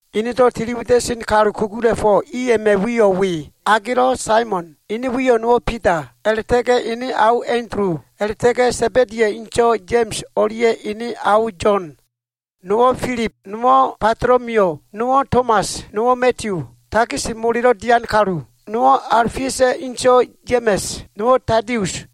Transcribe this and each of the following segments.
Enedo꞉ tiliwida꞉sen kalu kugula꞉fo꞉ i a꞉ma꞉ wiyo꞉ we. Agelo꞉ Saimon, ene wiyo꞉ nowo꞉ Bida, a꞉la꞉ta꞉ga꞉ ene ao Andulu, a꞉la꞉ta꞉ga꞉ Sa꞉ba꞉diya꞉ inso꞉ Ya꞉ma꞉s o꞉lia꞉ ene ao Yo꞉n. Nowo꞉ Filib, nowo꞉ Batolomiyu, nowo꞉ Tomas, nowo꞉ Madiyu, takis molelo꞉ dian kalu, nowo꞉ Aofiusa꞉ inso꞉ Ya꞉ma꞉s, nowo꞉ Tadius.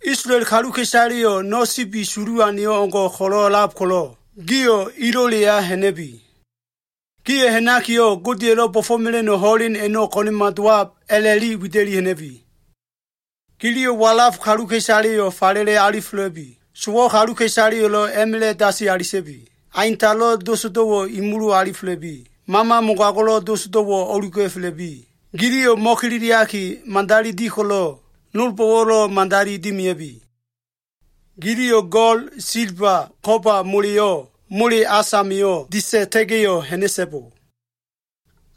Isolael kaluka꞉isaleyo꞉ no꞉ sibi sulu aneyo꞉ o꞉ngo꞉ ko꞉lo꞉lab ko꞉lo꞉, gio꞉ ilo꞉leya ha꞉na꞉bi. Gio꞉ ha꞉nakiyo꞉, ‘Godeya꞉lo꞉ bo꞉fo꞉mela꞉no꞉ ho꞉len a꞉no꞉ ko꞉na꞉ma dowab’ a꞉la꞉wida꞉li ha꞉na꞉bi. Giliyo꞉ walaf kaluka꞉isaleyo꞉ falele alifela꞉bi. Sowo꞉ kaluka꞉isaleyo꞉lo꞉ a꞉ma꞉la꞉ dasi alita꞉bi. Aintalo꞉ dosdo꞉wo꞉ imulu alifela꞉bi. Mama mogago꞉lo꞉ dosdo꞉wo꞉ o꞉luga꞉fela꞉bi. Giliyo꞉ mo꞉kililiaki, madali di ko꞉lo꞉, nolbo꞉wo꞉lo꞉ madali dimia꞉bi. Giliyo꞉ go꞉l, silba, ko꞉ba moleyo꞉ mole as amio꞉ disa꞉ta꞉ga꞉yo꞉ ha꞉na꞉so꞉bo.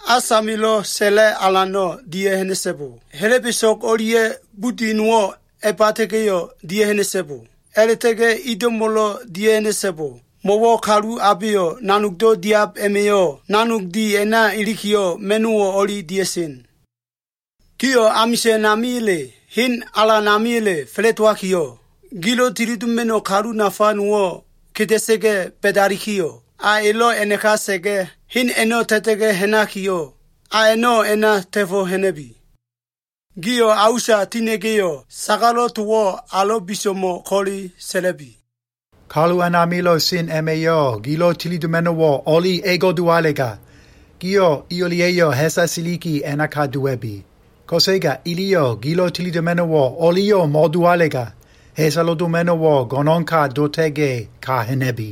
As amilo꞉ sa꞉la꞉ alano꞉ dia꞉ha꞉na꞉so꞉bo. Helebeso꞉g o꞉lia꞉ budi nowo꞉ a꞉bata꞉ga꞉yo꞉ dia꞉ha꞉na꞉so꞉bo. A꞉la꞉ta꞉ga꞉ ido꞉mo꞉lo꞉ dia꞉ha꞉na꞉so꞉bo. Mo꞉wo꞉ kalu abeyo꞉ nanogdo꞉ diab a꞉ma꞉yo꞉ nanog di a꞉na ilikiyo꞉, ma꞉no꞉wo꞉ o꞉li dia꞉sen. Gio꞉ amisa꞉n amiya꞉le, hen alan amiya꞉le fa꞉la꞉dowakiyo꞉, gilo꞉ tilidoma꞉no꞉ kalu nafa nowo꞉ keda꞉sa꞉ga꞉ ba꞉dalikiyo꞉, a elo꞉ a꞉naka sa꞉ga꞉, hen a꞉no꞉ ta꞉ta꞉ga꞉ ha꞉nakiyo꞉, a a꞉no꞉ a꞉na ta꞉fo꞉ ha꞉na꞉bi. Gio꞉ a usa tina꞉ga꞉yo꞉, sagalo꞉ towo꞉ alo꞉ biso꞉mo꞉ ko꞉le sa꞉la꞉bi. Kalu a꞉namilo꞉ sen a꞉ma꞉yo꞉ gilo꞉ tilidoma꞉no꞉wo꞉ o꞉li ego꞉ dowalega, gio꞉ i o꞉lia꞉yo꞉ ha꞉sa siliki a꞉naka dowa꞉bi. Ko꞉sega iliyo꞉ gilo꞉ tilidoma꞉no꞉wo꞉ o꞉liyo꞉ mo꞉dowalega, ha꞉salo꞉ doma꞉no꞉wo꞉ go꞉no꞉nka dota꞉ga꞉, ka ha꞉na꞉bi.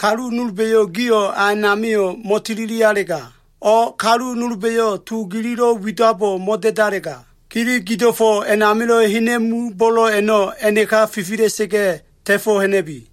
Kalu nolba꞉yo꞉ gio꞉ a a꞉namio꞉ mo꞉tililialega, o꞉ kalu nolba꞉yo꞉ to gililo꞉ widabo꞉ mo꞉da꞉dalega, gili gido꞉fo꞉ amilo꞉ hena꞉mu bo꞉lo꞉ a꞉no꞉ a꞉naka fifila꞉sa꞉ga꞉ ta꞉fo꞉ ha꞉na꞉bi.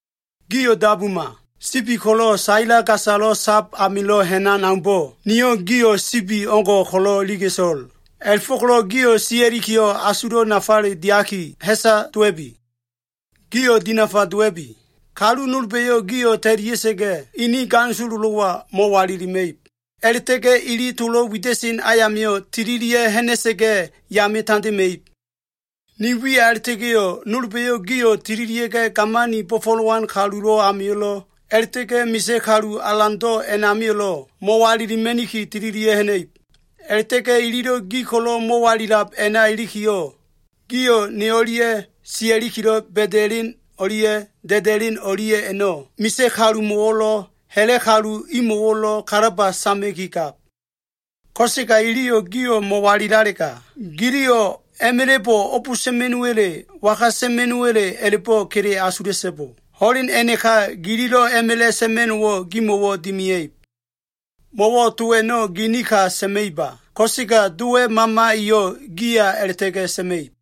“Gio꞉ dabuma! Sibi ko꞉lo꞉ saila gasalo꞉ sab amilo꞉ ha꞉nan aumbo꞉, niyo꞉ gio꞉ sibi o꞉ngo꞉ ko꞉lo꞉ iliga꞉to꞉l. A꞉la꞉fo꞉ko꞉lo꞉ gio꞉ sia꞉likiyo꞉, asulo꞉ nafale diaki, ha꞉sa dowa꞉bi. Gio꞉ dinafa dowa꞉bi. Kalu nolba꞉yo꞉ gio꞉ ta꞉lia꞉sa꞉ga꞉, ini ganisololo꞉wa mo꞉walilima꞉ib. A꞉la꞉ta꞉ga꞉ ili tolo꞉ wida꞉sen ayamio꞉ tililia꞉ ha꞉na꞉sa꞉ga꞉ yame tandema꞉ib. Ne wiya a꞉la꞉ta꞉ga꞉yo꞉, nolba꞉yo꞉ gio꞉ tililia꞉ga꞉ gamani bo꞉fo꞉lowan kalulo꞉ amio꞉lo꞉, a꞉la꞉ta꞉ga꞉ misa꞉ kalu alando꞉ a꞉namio꞉lo꞉ mo꞉walilima꞉niki tililia꞉ ha꞉na꞉ib. A꞉la꞉ta꞉ga꞉ ililo꞉ gi ko꞉lo꞉ mo꞉walilab a꞉na ilikiyo꞉, gio꞉ ne o꞉lia꞉ sia꞉likilo꞉ ba꞉da꞉len o꞉lia꞉ da꞉da꞉len o꞉lia꞉ a꞉no꞉ misa꞉ kalumo꞉wo꞉lo꞉, ha꞉la꞉ kalu imo꞉wo꞉lo꞉ kalaba sama꞉ki gab. Ko꞉sega iliyo꞉ gio꞉ mo꞉walilalega, giliyo꞉ a꞉ma꞉la꞉bo꞉ o꞉b sa꞉ma꞉no꞉wa꞉le, waga sa꞉ma꞉no꞉wa꞉le a꞉la꞉bo꞉ kele asula꞉so꞉bo. Ho꞉len a꞉naka gililo꞉ a꞉ma꞉la꞉ sa꞉ma꞉no꞉wo꞉ gimo꞉wo꞉ dimia꞉ib. Mo꞉wo꞉ to a꞉no꞉ ginin ka sa꞉ma꞉iba. Ko꞉sega Dowa꞉ Mama eyo꞉ giya a꞉la꞉ta꞉ga꞉ sa꞉ma꞉ib.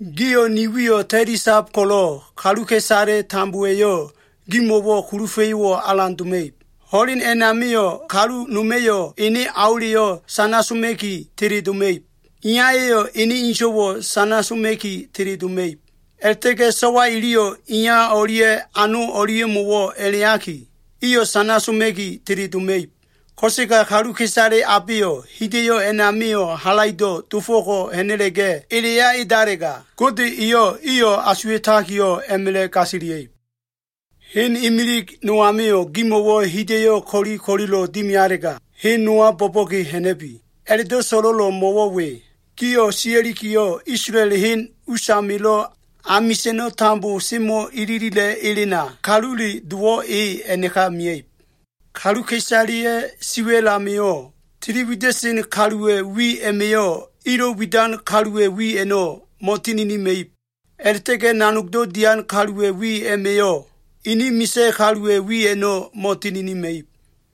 “Gio꞉ ni wiyo꞉ ta꞉lisab ko꞉lo꞉, kaluka꞉isale tambowa꞉yo꞉ gimo꞉wo꞉ kulufa꞉yo꞉wo꞉ alan doma꞉ib. Ho꞉len a꞉namio꞉ kalu noma꞉yo꞉ ene aoleyo꞉ sana soma꞉ki teledoma꞉ib. Iyaya꞉yo꞉ ene inso꞉wo꞉ sana soma꞉ki teledoma꞉ib. A꞉la꞉ta꞉ga꞉ so꞉wa iliyo꞉ iya o꞉lia꞉ ano o꞉lia꞉mo꞉wo꞉ a꞉la꞉iyaki, iyo꞉ sana soma꞉ki teledoma꞉ib. Ko꞉sega kaluka꞉isale abeyo꞉ hida꞉yo꞉ a꞉namio꞉ halaido꞉ dofo꞉ko꞉ ha꞉na꞉la꞉ga꞉ eleya edalega, Gode eyo꞉ iyo꞉ asuwa꞉takiyo꞉ a꞉ma꞉la꞉ gasilia꞉ib. “Hen imilig no amio꞉ gimo꞉wo꞉ hida꞉yo꞉ ko꞉li ko꞉lilo꞉ dimialega, hen nowa bo꞉bo꞉ge ha꞉na꞉bi. A꞉la꞉do꞉ so꞉lo꞉lo꞉ mo꞉wo꞉ we. Gio꞉ sia꞉likiyo꞉, Isolael hen usamilo꞉ amisa꞉no꞉ tambo semo꞉ ililila꞉ elena, Kalule Dowo꞉ e a꞉naka mia꞉ib. “Kaluka꞉isaleya꞉ siwa꞉l amio꞉, tili wida꞉sen kaluwa꞉ wi a꞉ma꞉yo꞉ ilo꞉ widan kaluwa꞉ wi a꞉no꞉ mo꞉tininima꞉ib. A꞉la꞉ta꞉ga꞉ nanogdo꞉ dian kaluwa꞉ wi a꞉ma꞉yo꞉, ini misa꞉ kaluwa꞉ wi a꞉no꞉ mo꞉tininima꞉ib.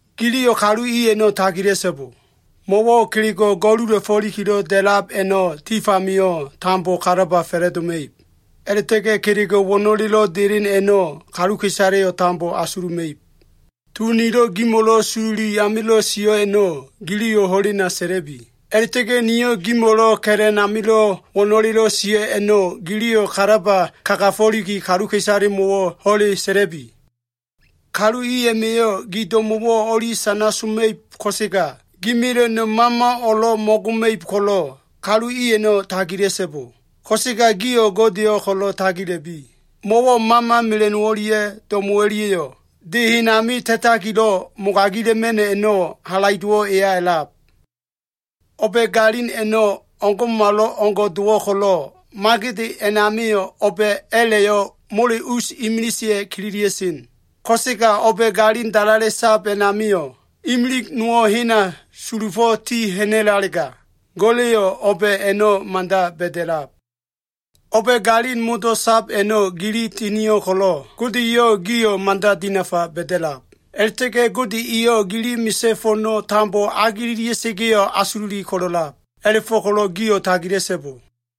“Giliyo꞉ kalu i a꞉no꞉ tagila꞉so꞉bo. Mo꞉wo꞉ kelego꞉ go꞉lula꞉fo꞉likilo꞉ da꞉lab a꞉no꞉, tif amio꞉ tambo kalaba fa꞉la꞉doma꞉ib. A꞉la꞉ta꞉ga꞉ kelego꞉ wo꞉no꞉lelo꞉ delen a꞉no꞉ kaluka꞉isaleyo꞉ tambo asuluma꞉ib. To nilo꞉ gimo꞉lo꞉ sololi amilo꞉ sio꞉ a꞉no꞉ giliyo꞉ ho꞉lena sa꞉la꞉bi. A꞉la꞉ta꞉ga꞉ nilo꞉ gimo꞉lo꞉ ka꞉la꞉n amilo꞉ wo꞉no꞉lelo꞉ sio꞉ a꞉no꞉, giliyo꞉ kalaba kagafo꞉liki kaluka꞉isalemo꞉wo꞉ ho꞉le sa꞉la꞉bi. Kalu i a꞉ma꞉yo꞉ gi do꞉mo꞉wo꞉ o꞉li sana soma꞉ib, ko꞉sega gi mela꞉no꞉ mama o꞉lo꞉ mo꞉goma꞉ib ko꞉lo꞉, kalu i a꞉no꞉ tagila꞉so꞉bo. Ko꞉sega gio꞉ Godeyo꞉ ko꞉lo꞉ tagila꞉bi. Mo꞉wo꞉ mama mela꞉no꞉ o꞉lia꞉ do꞉mo꞉ o꞉lia꞉yo꞉ de hen ami ta꞉takilo꞉ mogagila꞉ma꞉no꞉ a꞉no꞉ halaido꞉wo꞉ eya a꞉lab. O꞉ba꞉ galin a꞉no꞉ o꞉ngo꞉malo꞉ngo꞉ dowo꞉ ko꞉lo꞉, magede a꞉namio꞉ o꞉ba a꞉la꞉yo꞉ mole us imiliseya꞉ kililia꞉sen. Ko꞉sega o꞉ba꞉ galin dalale sab a꞉namio꞉ imilig nowo꞉ hena sulufo꞉ ti ha꞉na꞉lalega, Go꞉la꞉yo꞉ o꞉ba꞉ a꞉no꞉ mada ba꞉da꞉lab. O꞉ba꞉ galin modo꞉ sab a꞉no꞉ gili tinio꞉ ko꞉lo꞉, Gode eyo꞉ gio꞉ mada dinafa ba꞉da꞉lab. A꞉la꞉ta꞉ga꞉ Gode eyo꞉ gili misa꞉ fo꞉no꞉ tambo agelelia꞉sa꞉ga꞉yo꞉ asululi ko꞉lo꞉lab. A꞉la꞉fo꞉ko꞉lo꞉ gio꞉ tagila꞉so꞉bo.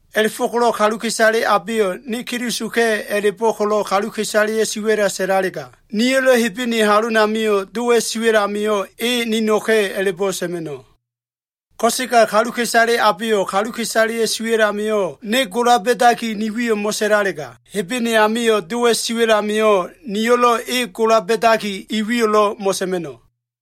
“A꞉la꞉fo꞉ko꞉lo꞉ kaluka꞉isale abeyo꞉ ‘Ne Kelisoka꞉’ a꞉la꞉bo꞉ ko꞉lo꞉ kaluka꞉isaleya꞉ siwa꞉la sa꞉lalega, niyo꞉lo꞉ Hebene halonamio꞉ Dowa꞉ siwa꞉l amio꞉ ‘E nino꞉ka꞉’ a꞉la꞉bo꞉ sa꞉ma꞉no꞉. Ko꞉sega kaluka꞉isale abeyo꞉ kaluka꞉isaleya꞉ siwa꞉l amio꞉ ne gola ba꞉daki, ni wiyo꞉ mo꞉sa꞉lalega, Hebene amio꞉ Dowa꞉ siwa꞉l amio꞉ niyo꞉lo꞉ e gola ba꞉daki, e wiyo꞉lo꞉ mo꞉sa꞉ma꞉no꞉.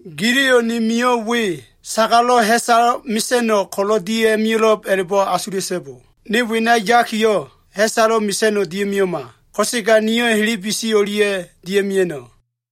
“Giliyo꞉ ne mio꞉ we, sagalo꞉ ha꞉salo꞉ mesa꞉no꞉ ko꞉lo꞉ dia꞉ mio꞉lo꞉b a꞉la꞉bo꞉ asula꞉so꞉bo. Ne wena yakiyo꞉ ha꞉salo꞉ mesa꞉no꞉ dia꞉ mio꞉ma. Ko꞉sega niyo꞉ helebesi o꞉lia꞉ dia꞉ mia꞉no꞉.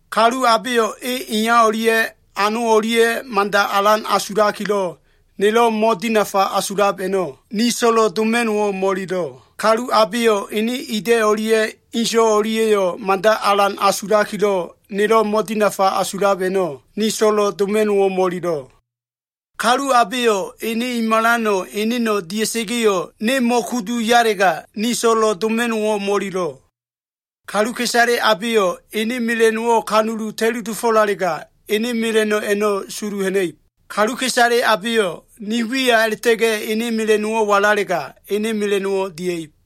“Kalu abeyo꞉ e iya o꞉lia꞉ ano o꞉lia꞉yo꞉ mada alan asulakilo꞉, nelo꞉ mo꞉dinafa asulab a꞉no꞉, ni so꞉lo꞉ doma꞉no꞉wo꞉ mo꞉ililo꞉. Kalu abeyo꞉ ene ida꞉ o꞉lia꞉ inso꞉ o꞉lia꞉yo꞉ mada alan asulakilo꞉, nelo꞉ mo꞉dinafa asulab a꞉no꞉, ni so꞉lo꞉ doma꞉no꞉wo꞉ mo꞉ililo꞉. Kalu abeyo꞉ ene i malano꞉ eneno꞉ dia꞉sa꞉ga꞉yo꞉ ne mo꞉kudu yalega, ni so꞉lo꞉ doma꞉no꞉wo꞉ mo꞉ililo꞉. Kaluka꞉isale abeyo꞉ ene mela꞉no꞉wo꞉ kanulu ta꞉li dofo꞉lalega, ene mela꞉no꞉ a꞉no꞉ sulu ha꞉na꞉ib. Kaluka꞉isale abeyo꞉ ne wiya a꞉la꞉ta꞉ga꞉ ene mela꞉no꞉wo꞉ walalega, ene mela꞉no꞉wo꞉ dia꞉ib.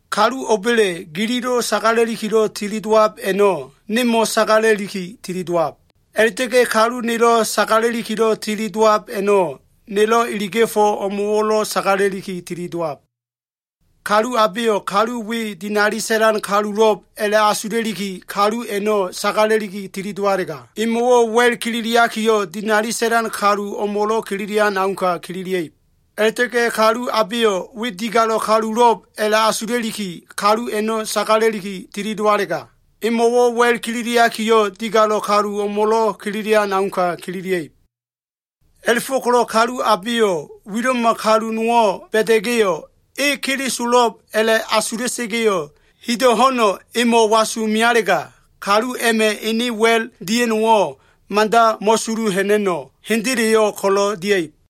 “Kalu o꞉ba꞉le gililo꞉ sagala꞉likilo꞉ tili dowab a꞉no꞉, nemo꞉ sagala꞉liki tili dowab. A꞉la꞉ta꞉ga꞉ kalu nelo꞉ sagala꞉likilo꞉ tili dowab a꞉no꞉, nelo꞉ iliga꞉fo꞉ o꞉mo꞉wo꞉lo꞉ sagala꞉liki tili dowab. Kalu abeyo꞉ ‘kalu we dinali sa꞉lan kalulo꞉b’ a꞉la꞉asula꞉liki, kalu a꞉no꞉ sagala꞉liki tilidowalega, emo꞉wo꞉ wa꞉l kililiakiyo꞉, dinali sa꞉lan kalu o꞉mo꞉lo꞉ kililian auka kililia꞉ib. A꞉la꞉ta꞉ga꞉ kalu abeyo꞉ ‘we digalo꞉ kalulo꞉b’ a꞉la꞉asula꞉liki, kalu a꞉no꞉ sagala꞉liki tilidowalega, emo꞉wo꞉ wa꞉l kililiakiyo꞉, digalo꞉ kalu o꞉mo꞉lo꞉ kililian auka kililia꞉ib. A꞉la꞉fo꞉ko꞉lo꞉ kalu abeyo꞉ wilo꞉ma kalu nowo꞉ ba꞉da꞉ga꞉yo꞉, ‘e Kelisolo꞉b’ a꞉la꞉ asula꞉sa꞉ga꞉yo꞉, hido꞉ ho꞉no꞉ emo꞉ wasu mealega, kalu a꞉ma꞉ ene wa꞉l dia꞉no꞉wo꞉ mada mo꞉sulu ha꞉na꞉no꞉, hendeleyo꞉ ko꞉lo꞉ dia꞉ib.”